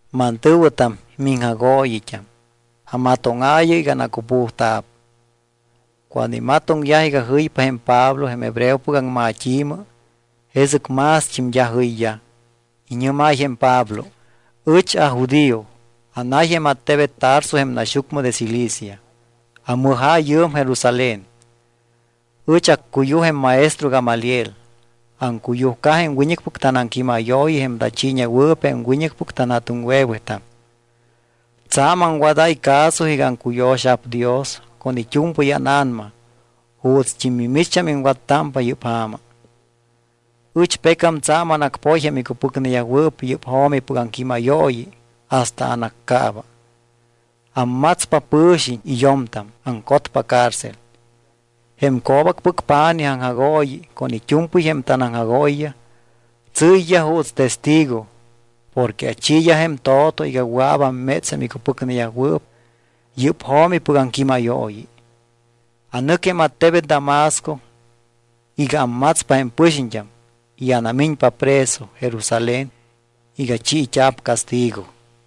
—Mantɨ̱wɨtam, miŋjagooyit́am, amatóŋaayɨ iga anacupujta̱p. Cuando imatoŋyaj iga jɨypa jém Pablo jém hebreopɨc aŋmat́i̱mɨ, jesɨc mást́im d́a jɨyyaj. Iñɨ́máy jém Pablo: —Ɨch ajudío. Anay jém attebet Tarso jém naxyucmɨ de Cilicia. Amɨja̱ yɨɨm Jerusalén. Ɨch accuyuj jém maestro Gamaliel. Aŋcuyujca jém wiñɨcpɨc tanaŋquímayooyi jém tachiiñewɨɨp jém wiñɨcpɨc tanja̱tuŋwe̱wetam. Tsa̱m aŋwadáy caso iga aŋcuyo̱xa̱p Dios con it́u̱mpɨy ána̱nama juutst́im mimicht́am iŋwattámpa yɨ́p ja̱ma. Ɨch pecam tsa̱m anacpoy jém icupɨcneyajwɨɨp yɨ́p jo̱mipɨc aŋquímayooyi hasta anaccaaba. Ammatspa pɨ̱xiñ y yo̱mtam, aŋcotpa cárcel. Jém co̱bacpɨc pa̱nij aŋjagooyi con it́u̱mpɨy jém tanaŋjagooyiyaj tsɨ́yyaj juuts testigo porque achiiyaj jém to̱to iga wɨa̱p amméts jém icupɨcneyajwɨɨp yɨ́p jo̱mipɨc aŋquímayooyi. Anɨc jém attebet Damasco iga ammatspa jém pɨxiñt́am y anamiñpa preso Jerusalén iga chiit́a̱p castigo.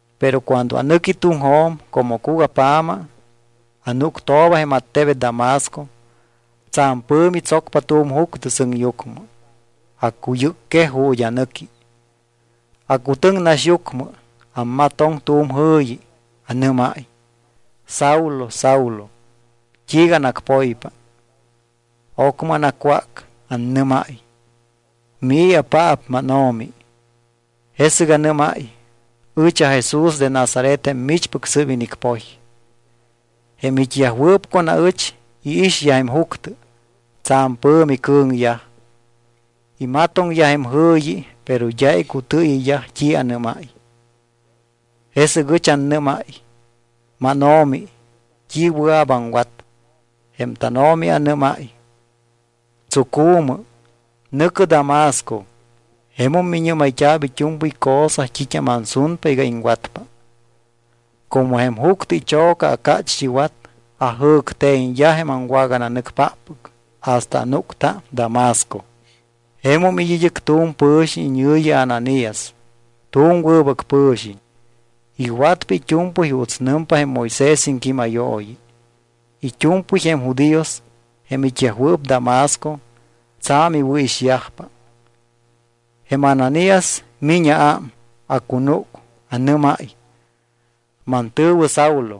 ’Pero cuando anɨqui tuŋjo̱m, como cugapja̱ma, anúctooba jém attebet Damasco, tsa̱m pɨ̱mi tsocpa tu̱m juctɨ sɨŋyucmɨ. Acuyɨcquej ju̱t́ anɨqui. Acutɨŋ naxyucmɨ. Amatoŋ tu̱m jɨ̱yi. Anɨ́máy: “¿Saulo, Saulo, t́iiga anacpoypa?” Ocmɨ anacwác. Annɨ́máy: “¿Mii̱apaap, mánO̱mi?” Jesɨc anɨ́máy: “Ɨch aJesús de Nazaret jém michpɨc sɨ́p inicpoy.” Jém it́yajwɨɨp con aɨch iixyaj jém juctɨ. Tsa̱m pɨ̱mi cɨ̱ŋyaj. Imatoŋyaj jém jɨ̱yi, pero d́a icutɨɨyɨyyaj t́i anɨ́máy. Jesɨc ɨch annɨ́máy: “¿MánO̱mi, t́i wɨa̱p aŋwat?” Jém tánO̱mi anɨ́máy: “Tsucu̱mɨ, nɨ̱cɨ Damasco, jemum miñɨ́mayt́a̱p it́u̱mpɨy cosa t́it́am ansunpa iga iŋwatpa.” Como jém juctɨ icho̱ca acácht́iwat, ajɨ̱cte̱ñyaj jém aŋwagananɨcpáppɨc hasta anúcta Damasco. ’Jemum it́ id́ɨc tu̱m pɨ̱xiñ iñɨ̱yi Ananías. Tu̱m wɨbɨc pɨ̱xiñ. Iwatpa it́u̱mpɨy juuts nɨmpa jém Moisés iŋquímayooyi. It́u̱mpɨy jém judíos, jém it́yajwɨɨp Damasco, tsa̱m iwɨ̱ixyajpa. Jém Ananías miñ aám. Acunúc, anɨ́máy: “Mantɨ̱wɨ Saulo,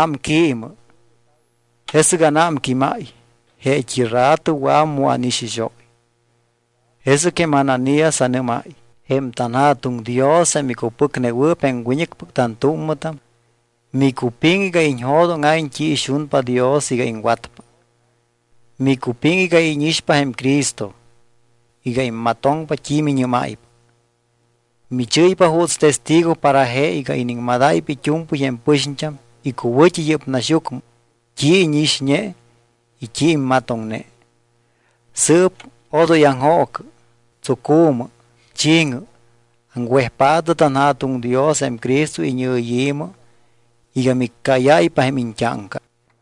ámquiimɨ.” Jesɨc anámquímáy, jeet́i rato wɨa̱wum mu ánixixóy. Jesɨc jém Ananías anɨmáy: “Jém tanJa̱tuŋ Dios jém icupɨcnewɨɨp jém wiñɨcpɨc tantúmmɨtam, micupiŋ iga iñjo̱dóŋa̱iñ t́i ixunpa Dios iga iŋwatpa. Micupiŋ iga íñixpa jém Cristo, iga immatoŋpa t́i miñɨ́máypa. Michɨ́ypa juuts testigo para je iga iniŋmadáypa it́u̱mpɨy jém pɨxiñt́am icuwɨ̱t́i yɨ́p naxyucmɨ t́i íñixñe y t́i immatoŋne. Sɨɨp odoy aŋjoocɨ, tsucu̱mɨ, chi̱ŋɨ. Aŋwejpaatɨ tanJa̱tuŋ Dios jém Cristo iñɨyi̱mɨ iga miccáyáypa jém iñt́áŋca.”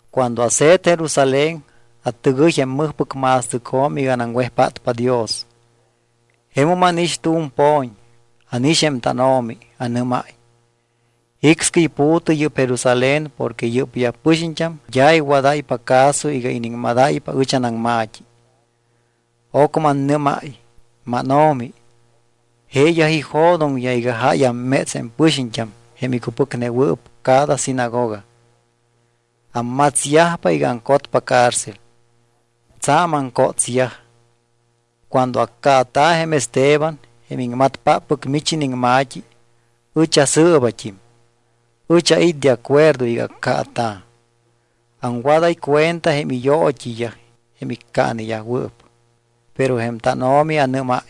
’Cuando ase̱t Jerusalén atɨgɨy jém mɨjpɨc ma̱stɨcjo̱m iga anaŋwejpátpa Dios. Jemum ánix tu̱m po̱ñ. Ánix jém tánO̱mi. Anɨ́máy: “Jicscɨy pu̱tɨ yɨ́p Jerusalén porque yɨ́pyaj pɨxiñt́am d́a iwadáypa caso iga iniŋmadáypa ɨch anaŋma̱t́i.” Ocmɨ annɨ́máy: “MánO̱mi, jeeyaj ijo̱doŋyaj iga jáy amméts jém pɨxiñt́am jém micupɨcnewɨɨp cada sinagoga. Ammatsyajpa iga aŋcotpa cárcel. Tsa̱m aŋcótsyaj. Cuando accaata̱ jém Esteban, jém iŋmatpáppɨc mich iniŋma̱t́i, ɨch asɨɨbat́im. Ɨch ait́ de acuerdo iga accaata̱. Aŋwadáy cuenta jém iyoot́iyaj jém iccaaneyajwɨɨp.” Pero jém tánO̱mi anɨ́máy: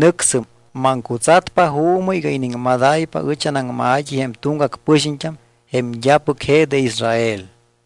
“Nɨcsɨm. Maŋcutsatpa juumɨ iga iniŋmadáypa ɨch anaŋma̱t́i jém tuŋgac pɨxiñt́am jém d́apɨc je de Israel.”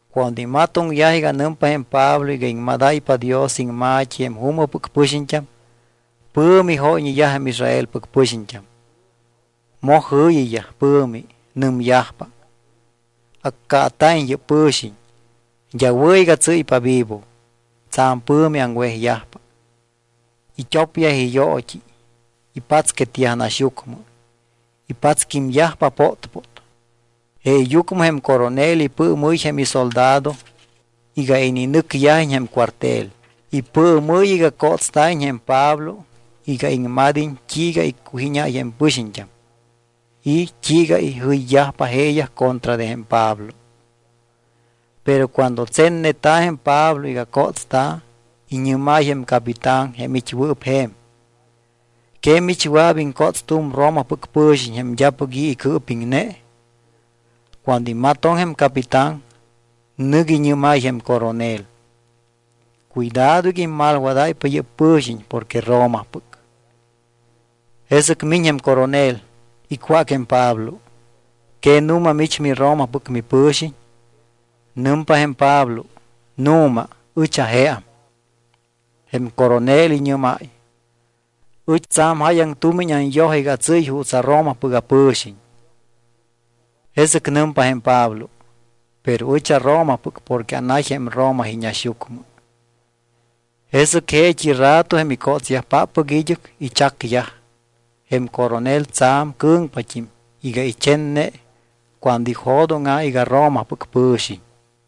Cuando imatoŋyaj iga nɨmpa jém Pablo iga iŋmadáypa Dios iŋma̱t́i jém juumɨpɨc pɨxiñt́am, pɨ̱mi jóyñeyaj jém Israelpɨc pɨxiñt́am. Moj jɨ̱yiyaj pɨ̱mi. Nɨmyajpa: —Accaata̱iñ yɨ́p pɨ̱xiñ. D́a wɨ̱ iga tsɨ́ypa vivo. Tsa̱m pɨ̱mi aŋwejyajpa. It́opyaj iyoot́i, ipatsquetyaj naxyucmɨ. Ipatsquímyajpa pótpót. Jeeyucmɨ jém coronel ipɨɨmɨ́y jém isoldado iga ininɨcyajiñ jém cuartel. Ipɨɨmɨ́y iga cótsta̱iñ jém Pablo iga iŋmad́iñ t́iiga iccujíñáy jém pɨxiñt́am y t́iiga tsa̱m jɨyyajpa jeeyaj acontra de jém Pablo. Pero cuando tsenneta̱ jém Pablo iga cótsta̱, iñɨ́máy jém capitán jém it́wɨɨp je̱m: —¿Que mich wɨa̱p iŋcóts tu̱m Romapɨc pɨ̱xiñ jém d́apɨc i̱ icɨɨpiŋne? Cuando imatoŋ jém capitán, nɨc iñɨ́máy jém coronel: —Cuidado iga immalwadáypa yɨ́p pɨ̱xiñ porque Romapɨc. Jesɨc miñ jém coronel, icwác jém Pablo: —¿Que nu̱ma mich miRomapɨc mipɨ̱xiñ? Nɨmpa jém Pablo: —Nu̱ma, ɨch ajeam. Jém coronel iñɨ́máy: —Ɨch tsa̱m jáyaŋ tumiñ anyoj iga atsɨ́y juuts aRomapɨc apɨ̱xiñ. Jesɨc nɨmpa jém Pablo: —Pero ɨch aRomapɨc porque anay jém Roma iñaxyucmɨ. Jesɨc jeet́i rato jém icótsyajpáppɨc id́ɨc ichacyaj. Jém coronel tsa̱m cɨ̱ŋpat́im iga ichenne cuando ijo̱dóŋa̱ iga Romapɨc pɨ̱xiñ.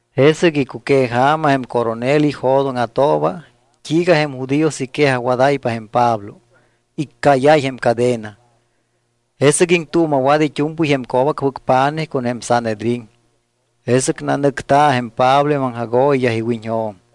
Jesɨc icuqueja̱ma jém coronel ijo̱dóŋa̱tooba t́iiga jém judíos iquejajwadáypa jém Pablo. Iccáyáy jém cadena. Jesɨc iŋtuuma̱wat it́u̱mpɨy jém co̱bacpɨc pa̱nij con jém Sanhedrín. Jesɨc nanɨcta̱ jém Pablo jém aŋjagooyiyaj iwiñjo̱m.